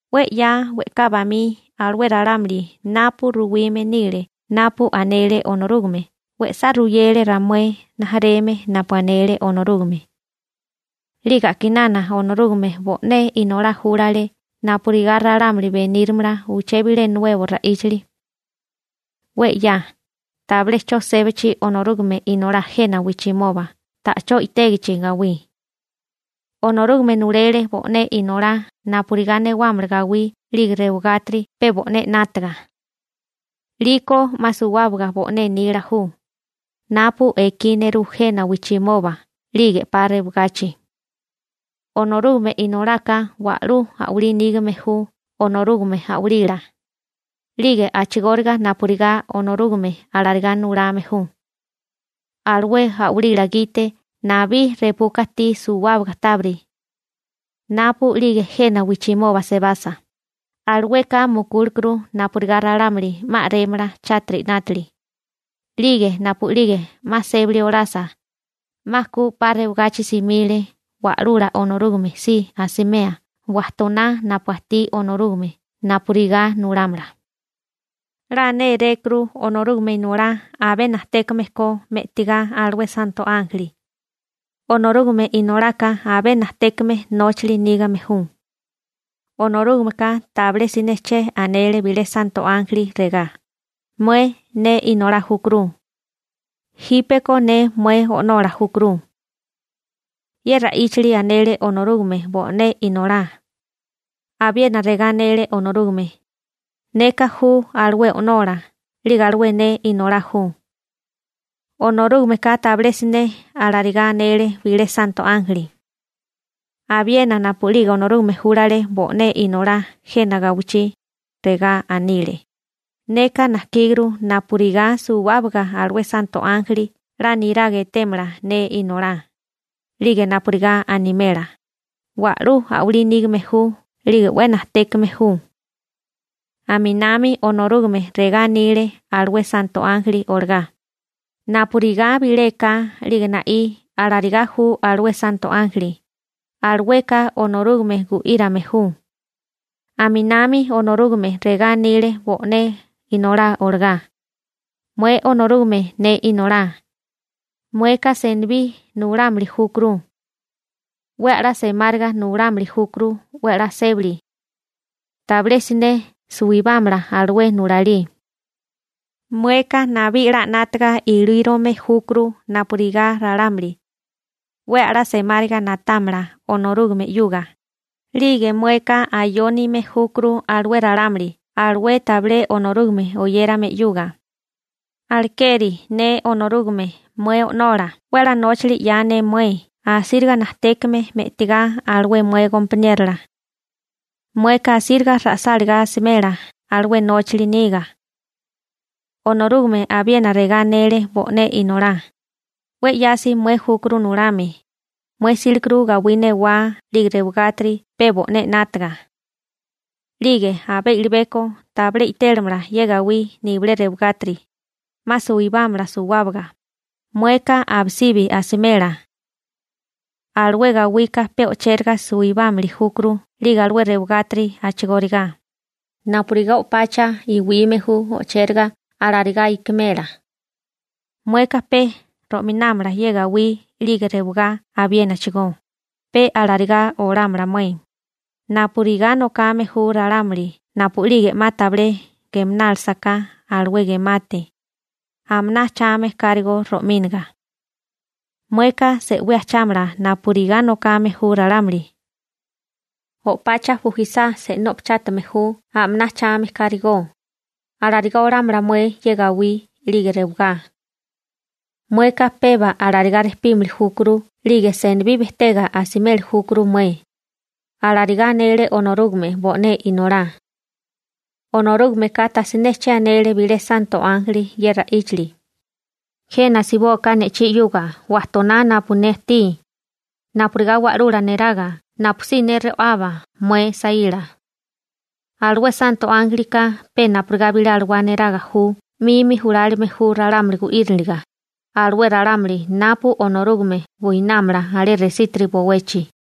'We 'ya we'ká bamí alué ralámuli napu ruwime nile napu anele Onorúgame we'sá ruyele ramué rijimala napu anele Onorúgame. 'Lige a'kinana Onorúgame bo'né Inolá júlale napurigá ralámuli benírimala uché bilé nuebo ra'íchali. 'We 'ya, tabilé 'cho sébachi Onorúgame Inolá jena wijchimoba ta'chó i'tégichi gawí, Onorúgame nulele bo'né Inolá napurigá newámala gawí 'lige rewagátiri pe bo'né 'nátaga. 'Liko 'ma suwábaga bo'né nila ju, napu ekí nerú jena wijchimoba 'lige 'pa rewagachi. Onorúgame Inolaka wa'lú a'walí nígame ju Onorúgame a'walila, 'lige a'chigóriga napurigá Onorúgame alarigá nulame ju. Alué a'walila gite nabí repuka ajtí suwábaga tábiri. Napu'lige jena wijchimoba sebasa, alueka mukúlekuru napurigá ralámuli 'ma a'rémala chátiri 'nátili. 'Lige napu'lige 'ma sébali olasa, 'ma ku 'pa rewagachi simile Wa'lula Onorúgame si asimea wajtoná napu ajtí Onorúgame napurigá nulámala. 'La nérékuru Onorúgame Inolá abé najtékame ko me'tigá alué santo ánjeli. Onorúgame Inolaka abé najtékame nóchali nígame ju. Onorúgameka tabilé siné che anele bilé santo ánjeli regá: Mué ne Inolá júkuru. Jípeko ne mué O'nola júkuru. Ye ra'íchali anele Onorúgame bo'né Inolá. Abiena regá anele Onorúgame: Neka ju alué O'nola, 'lige alué ne Inolá ju. Onorúgameka tabilé siné alarigá anele bilé santo ánjeli. Abiena napu'lige Onorúgame júlale bo'né Inolá jena gawichí, regá anile: Neka najkíguru napurigá suwábaga alué santo ánjeli 'la niraga etémala ne Inolá, 'lige napurigá animela: «Wa'lú a'walí nígame ju 'lige 'we najtékame ju.» Aminami Onorúgame regá anile alué santo ánjeli olagá: Napurigá bilé eká 'lige na'í alarigá ju alué santo ánjeli, alueka Onorúgame gu'írame ju. Aminami Onorúgame regá anile bo'né Inolá olagá: Mué Onorúgame ne Inolá, mueka senibí nulámili júkuru. 'We a'lá semáriga nulámili júkuru 'we a'lá sébali. Tabilé siné suwibámala alué nulalí. Mueka nabí 'la 'nátaga ilírome júkuru napurigá ralámuli 'we a'lá semáriga na'támala Onorúgame 'yuga, 'lige mueka ayónime júkuru alué ralámuli alué tabilé Onorúgame oyérame 'yuga, alekeri ne Onorúgame mué O'nola 'we a'lá nóchali 'ya ne mué asíriga najtékame me'tigá alué mué gompaniérola. Mueka asíriga ra'sálagá asimela alué nóchali niga. Onorúgame abiena regá anele bo'né Inolá: 'We 'yasi mué júkuru nulame, mué 'sílekuru gawí newá 'lige rewagátiri pe bo'né 'nátaga. 'Lige abé i'libeko tabilé i'télamala ye gawí nibilé rewagátiri, 'ma suwibámala suwábaga, mueka abisibi asimela. Alué gawika pe o'chéraga suwibámili júkuru 'lige alué rewagátiri a'chigóriga, napurigá o'pacha iwime ju o'chéraga alarigá i'kimela. Mueka pe ro'minámala ye gawí 'lige rewagá abiénachigó, pe alarigá olámala mué, napurigá nokame ju ralámuli napu'lige 'ma tabilé gemanálasaká alué gemate, a'maná ajchame kárigó ro'míniga. Mueka se'wí ajchámala napurigá nokame ju ralámuli. O'pacha bujisá se'nú o'pachátime ju a'maná ajchame kárigó, alarigá olámala mué ye gawí 'lige rewagá. Mueka peba alarigá rejpímili júkuru 'lige senibí bejtega asimeli júkuru mué. Alarigá anele Onorúgame bo'né Inolá. Onorúgameka tajsiné che anele bilé santo ánjeli ye ra'íchali: Jena asibóká ne'chí 'yuga wajtoná napu ne ajtí napurigá wa'lula neraga napusí ne ro'aba mué saíla. Alué santo ánjelika pe napurigá bilé alawá niraga ju 'mimi julálime ju ralámuli gu'íriniliga, alué ralámuli napu Onorúgame buinámala alé resítiri bowechi.